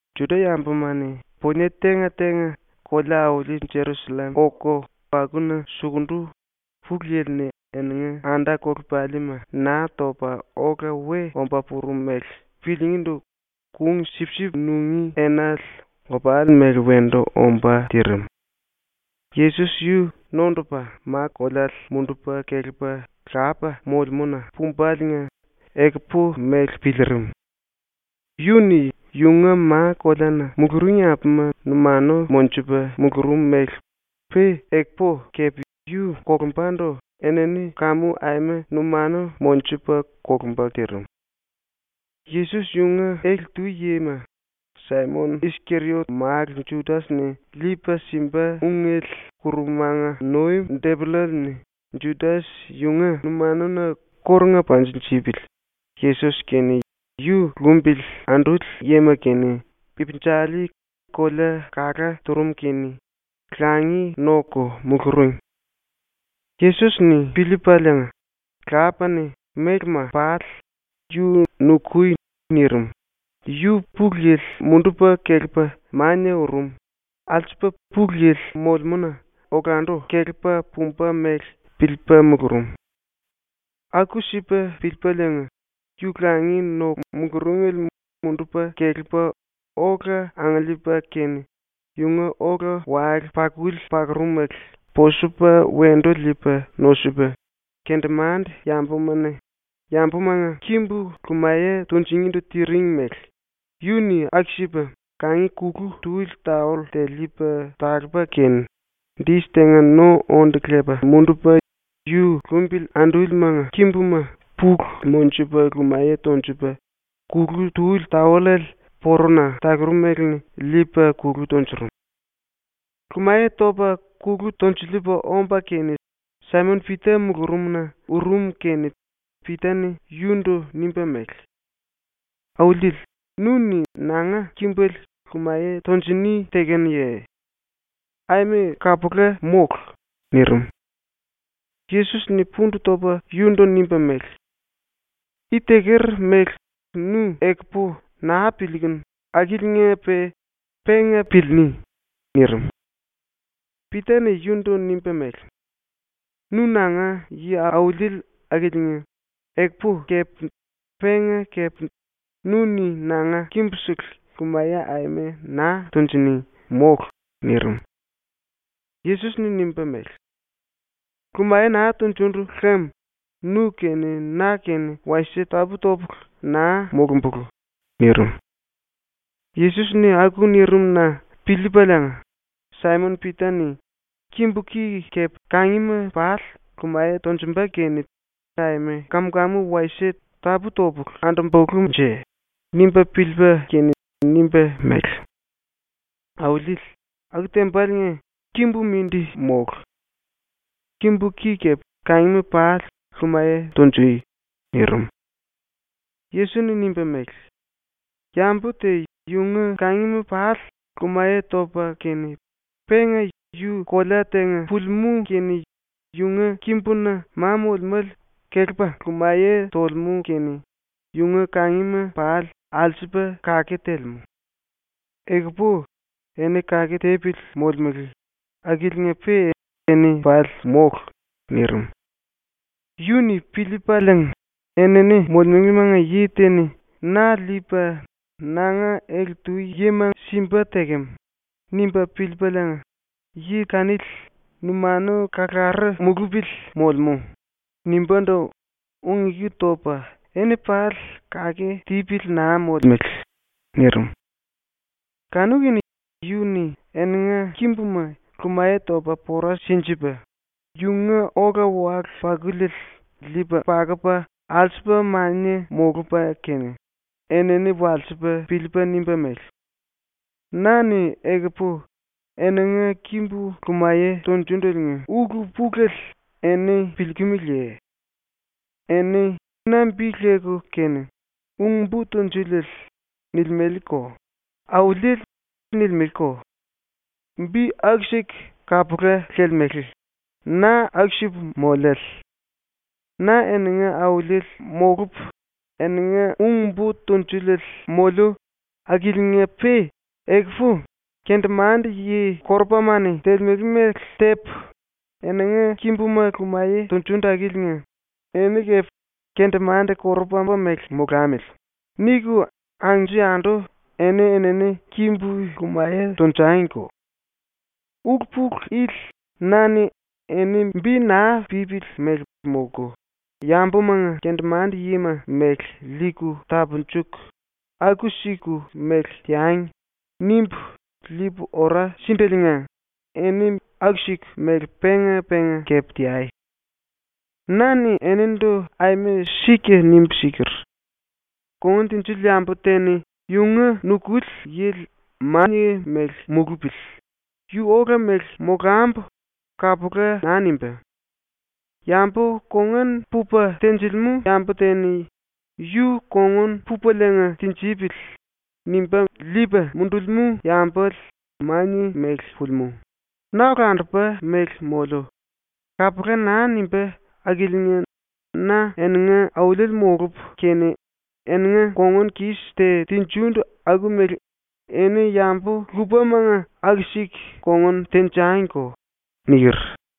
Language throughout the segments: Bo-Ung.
⸤Juda-yambuma-ni punie tenga-tenga kolea-auli Jerusallem oku akuna sukundu⸥ Pulu Yili-ni eninga anda-kolepalima Naa Topa Ola We Omba Purum mele piliingíndu kung-sipsip nungí enale opali mele wendu ombá tirim. Yesos yu nondupa ma-koleale mundupa kelepa Lapa molemúna pumbaliinga ekupu mele piliirim. Yu-ni yunga ma-koleana muluring yambuma numanu monjupa mulurum mele pe ekupu kepe yu kolumbandu enini kamu aima numanu monjupa kolumba tirim. Yesos yunga ele-tu yima Saimon-Iskeriot málu Judas-ni liipa simba ungele ⸤kurumanga nuim⸥ depollale-ni Judas yunga numanuna kórunga panjinjipili, Yesos kene yu lumbili anduli yima kene ipinjali kolea kala turum kene langi noku muluring. Yesos-ni piliipaliinga, Lapa-ni mélema pali yu “Nukui.” nirim, yu Pulu Yili mundupa kelepa mania urum, alsupa Pulu Yili molemúna olandu kelepa pumba mele piliipa mulurum. Aku-sipa piliipaliinga, yu langi noku muluringele mundupa kelepa ola angiliipa kene yunga ola-wale-pakuli pakurumele posupa wendu liipa nosupa, kendemande-yambuma-ni yambumanga kimbu lumaye tunjingindu tiring mele yu-ni aku-sipa kangi kulu tuli taoll te liipa talupa kene, dis tenga no onde lepa mundupa yu lumbili andúlimanga kimbuma pulu monjupa lumaye tonjupa kulu tuli taollale porona talurumele-ni liipa kulu tunjurum. Lumaye topa kulu tonjiliipa omba kene Saimon-Pita mulurumna urum kene Pita-ni yundu nimba mele: “Auliele, nu-ni nanga kimbele lumaye tunjini tekenuye? Aima kapula mólu!” nirim. Yesos-ni pundu topa yundu nimba mele: “I teker mele nu ekupu naa piliikunu akiliinga-pe penga piliiní.” nirim. Pita-ni yundu nimba mele: “Nu nanga yi-auliele akiliinga ekupu kepe penga kepe nu-ni nanga kimbusele lumaye aima naa tunjini, mólu!” nirim. Yesos-ni nimba mele: “Lumaye naa tunjundu lem nu-kene na-kene wasie tapú-topulu naa molumbulú.” nirim. Yesos-ni aku nirim-na piliipaliinga Saimon-Pita-ni ⸤‘Kimbu ki kepe kangima pali lumaye tonjumba kene aima kam-kamu wasie tapú-topulu andumbulunje.’ nimba piliipa kene⸥ nimba mele: “Auliele, aku tembaliinga kimbu mindi mólu! Kimbu ki kepe kangima pali lumaye tunjui!” nirim. Yesos-ni nimba mele: “Yambu te yunga kangima pali lumaye topa kene penga yu kolea tenga pulimú kene yunga kimbuna ma molemále kelepa lumaye tolemú kene yunga kangima pali alsupa kake telemú. Ekupu eni kake tipili molemele, akiliinga-pe eni pali mólu.” nirim. Yu-ni piliipaliinga ‘Enini molemelemanga yi te-ni na liipa nanga ele-tu yima simba tekem.’ nimba piliipaliinga ‘Yi kanili numanu kalaru mulupili molemú.’ nimbándu ung-eku topa “Eni pali kake tipili naa molemele.” nirim. Kanu-kene yu-ni eninga kimbuma lumaye topa pora sinjipa, yunga ola-wale-pakuliele liipa pakupa alsupa mania molupa kene, enini walsipa piliipa nimba mele: “Na-ni ekupu eninga kimbu lumaye tunjundeliinga ulu-pulele eni piliikimiliye? Eni na bi leku kene “Ung-Bo Tunjuliele” nilimeleko, “Auliele” nilimeleko. Bi akusele kapula lelemele, na aku-sipu moliále. Na eninga Auliele molupu eninga Ung-Bo Tunjuliele moliu akiliinga-pe ekupu kendemande-yi korupama-ni telemele mele tepu eninga kimbuma lumaye tunjundu akiliinga eni kepe ‘Kendemande-korupama mele molamili.’ niku anju-yandu eni-enini kimbu lumaye tonjangiko. Ulu-pulu ili na-ni ‘Eni ⸤bi naa pípili mele molku, yambumanga kendemande-yima mele liiku tapunjuku,⸥ aku-siku mele teangi.’ nimbu liipu ora sindeliinga eni aku-siku mele penga-penga kepe teai. “Na-ni enindu aima sika nimbu siker: “Kongun tinjili yambu te-ni yunga nukuli yili ‘Mania mele mulupili.’ yu ‘Ola mele molambu.’ kapula naa nimbá. Yambu kongun pupa tenjilimú yambu te-ni ‘Yu kongun pupaliinga tinjipili.’ nimba liipa mundulimú yambale ‘Mania mele pulimú. Na olandupa mele moliu.’ kapula naa nimbá akiliinga na eninga auliele molupu kene eninga kongun-kis te tinjindu aku-mele eni yambu lupamanga aku-siku kongun tenjangiko.” niker.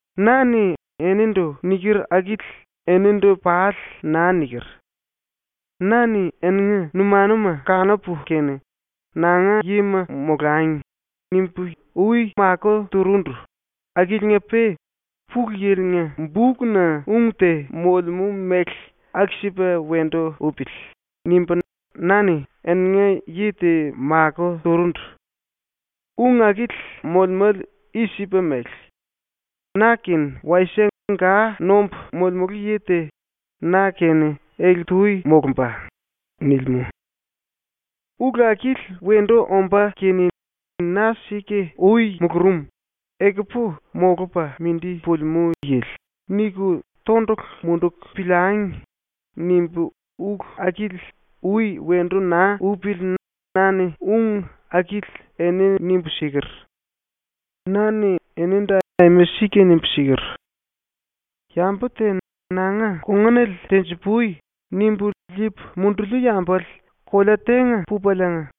“Na-ni “enindu” niker akili enindu pali naa niker. Na-ni eninga numanuma kanupu kene ‘Nanga yima molangi.’ nimbu ui makó turundu, akiliinga-pe ‘Pulu Yili-nga bukna ung te molemú mele aku-sipa wendu upili.’ nimbu na-ni eninga yi te makó turundu. Ung akili molemále i-sipa mele: “Na-kene wasie ga nombu molemulu yi te na-kene ele-tu molumba.” nilimú. “‘Ulu akili wendu ombá kene ‘Na sika ui mulurum, ekupu molupa mindi pulimú yili.’ niku tondulu munduku piliangi.’ nimbu ulu akili ui wendu naa upili na-ni ung akili eni nimbu siker. Na-ni enindu aima sika nimbu siker: “Yambu te “Nanga kongunale tenji-pui.” nimbu liipu munduliu yambale kolea tenga pupaliinga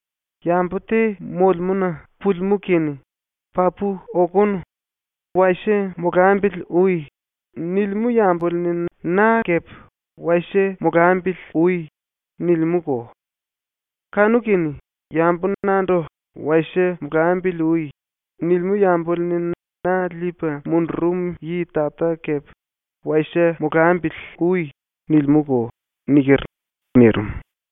yambu te molemúna pulimú kene ‘Papu okonu. Wasie molambili ui.’ nilimú yambale-ni na kepe ‘wasie molambili ui.’ nilimúko. Kanu-kene yambu nandu “Wasie molambili ui.” nilimú yambale-ni na liipa mundurum yi Tata kepe “Wasie molambili ui.” nilimúko.” niker.” nirim.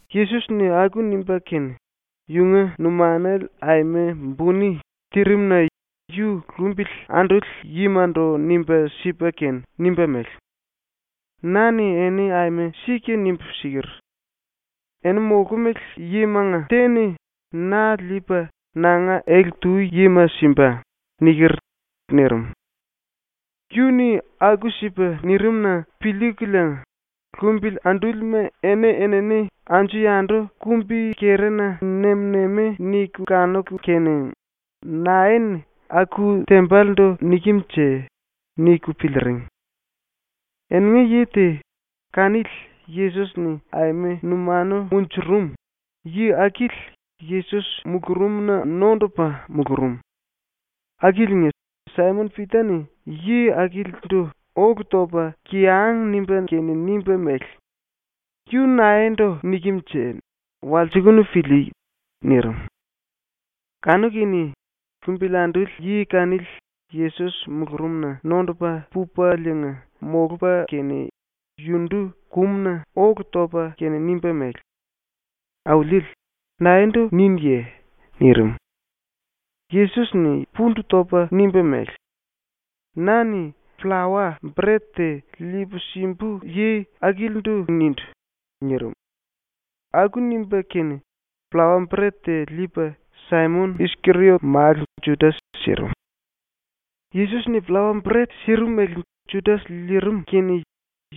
Yesos-ni aku nimba kene, yunga numanale aima buni tirim-na yu lumbili anduli yimandu nimba sipa kene nimba mele: “Na-ni eni aima sika nimbu siker: “Eni molkumele yimanga te-ni na liipa nanga ele-tu yima simba.” niker.” nirim. Yu-ni aku-sipa nirim-na piliikuliinga lumbili andúlima eni-enini anju-yandu kumbi-kerina nem-nemi niku kanuku kene ‘Nae-ni aku tembalendu nikem-nje?’ niku piliiring. Eninga yi te, kanili Yesos-ni aima numanu munjurum, yi akili Yesos mulurumna nondupa mulurum. Akiliinga, Saimon-Pita-ni yi akilindu ólu topa kiyang nimba kene nimba mele: “Yu naendu nikem-nje? Walsikunu pilíí.” nirim. Kanu-kene lumbili anduli yi kanili Yesos mulurumna nondupa pupaliinga molupa kene yundu kumuna ólu topa kene nimba mele: “Auliele, naendu ninuye?” nirim. Yesos-ni pundu topa nimba mele: “Na-ni pllawa-bret te liipu simbu yi akilindu nindu.” nirim. Aku nimba kene pllawa-bret te liipa Saimon-Iskeriot málu Judas sirim. Yesos-ni pllawa-bret sirimele Judas liirim kene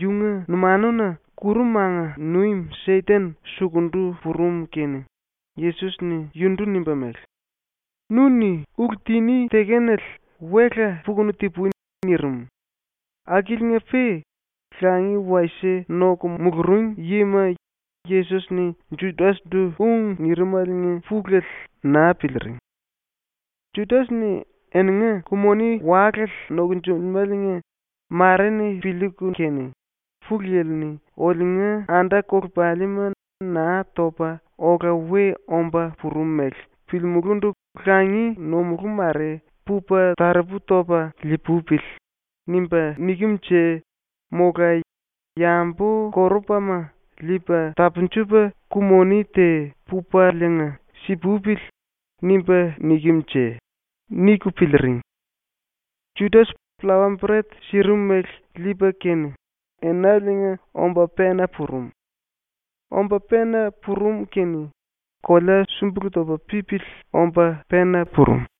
yunga numanuna ⸤kurumanga nuim⸥ Seten sukundu purum kene Yesos-ni yundu nimba mele: “Nu-ni ulu tiní tekenale wela pukunu ti-pui.” nirim, akiliinga-pe langi wasie noku muluring yima Yesos-ni Judas-ndu ung nirimaliinga pulele naa piliiring. Judas-ni eninga ku-moni walale nokonjulemáliinga mare-ni piliiku kene, ‘ ‘Pulu Yili-ni oliunga anda-kolepalima Naa Topa Ola We Omba Purum mele piliimulúndu langi nomulú mare pupa taropu topa lii-pupili.’ nimba nikem-nje mola ‘Yambu-korupama liipa tapunjupa ku-moni te pupaliinga si-pupili.’ nimba nikem-nje.’ niku piliiring. Judas pllawa-bret sirimele liipa kene enaliinga omba pena purum. Omba pena purum kene kolea súmbulu topa pípili omba pena purum.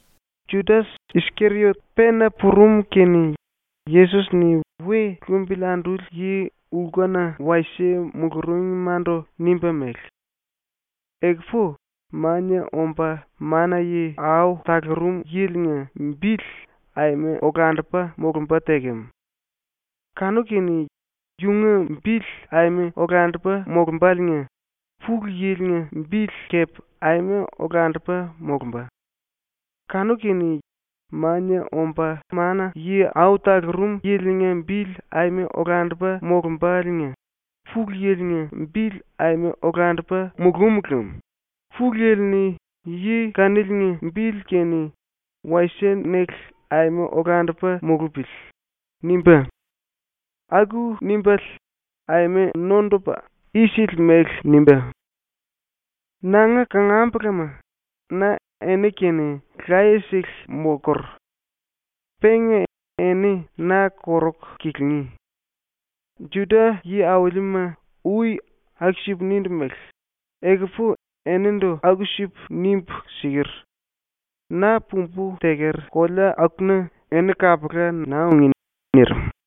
Judas-Iskeriot pena purum kene Yesos-ni we lumbili anduli yi lkuna wasie muluringmandu nimba mele: “Ekupu Mania Omba Mana-Yi Au Talurum Yili-nga bili aima olandupa molumba tekem. Kanu-kene yunga bili aima olandupa molumbáliinga Pulu Yili-nga bili kepe aima olandupa molumba. Kanu-kene Mania Omba Mana-Yi Au Talurum Yili-nga bili aima olandupa molumbáliinga Pulu Yili-nga bili aima olandupa mulúm lem Pulu Yili-ni yi kaniliinga bili kene ‘wasie-nele aima olandupa mulupili.’ nimbá. Aku nimbále aima nondupa isili mele nimbá. “Nanga kangambulama, na eni-kene laye-sele molkur. Penga eni na koruku kilingí. Juda yi-aulima ui aku-sipu nindu mele ekupu enindu aku-sipu nimbu siker. Na pumbu teker kolea akuna eni kapula naa ungí.” ⸤nirim.⸥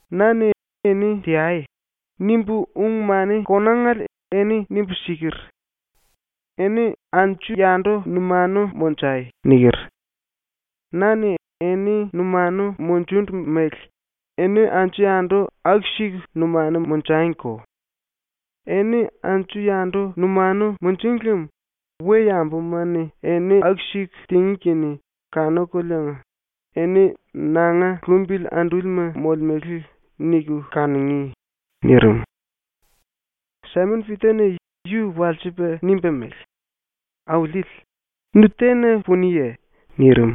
“Na-ni ‘eni teai.’ nimbu ung-mani konangale eni nimbu siker: “Eni anju-yandu numanu monjai.” niker. Na-ni eni numanu munjundu mele eni anju-yandu aku-siku numanu monjangiko. Eni anju-yandu numanu munjung lem we-yambuma-ni eni aku-siku tingí kene kanukuliinga ‘Eni nanga lumbili andúlima molemele.’ niku kanungí.” nirim. Saimon-Pita-ni yu walsipa nimba mele: “Auliele, nu tena puniye?” nirim.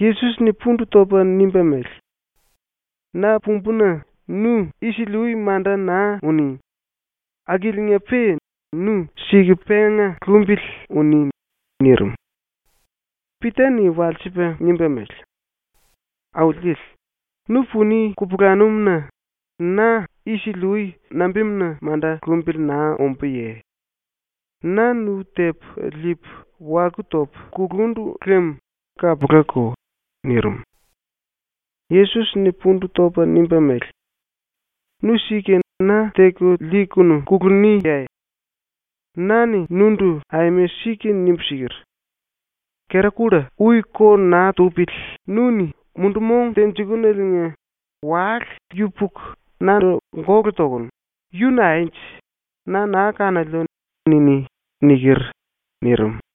Yesos-ni pundu topa nimba mele: “Na pumbúna nu isili-ui manda naa uní. Akiliinga-pe nu sika penga lumbili uní.” nirim. Pita-ni walsipa nimba mele: “Auliele, nu puni kupulanum-na na isili-ui nambimuna manda lumbili naa ombúye? Na nu tepu liipu waku topu kulundu lem kapulako.” nirim. Yesos-ni pundu topa nimba mele: “Nu sika na teku liikunu kuluniye? Na-ni nundu aima sika nimbu siker: “Kera-kulla ui ko naa tupili nu-ni ⸤mundu-mong tenjikunuliinga⸥ wale yupuku nandu gólu tokunu “Yu naenje? Na naa kanoliu.” niní.” niker.” ⸤nirim.⸥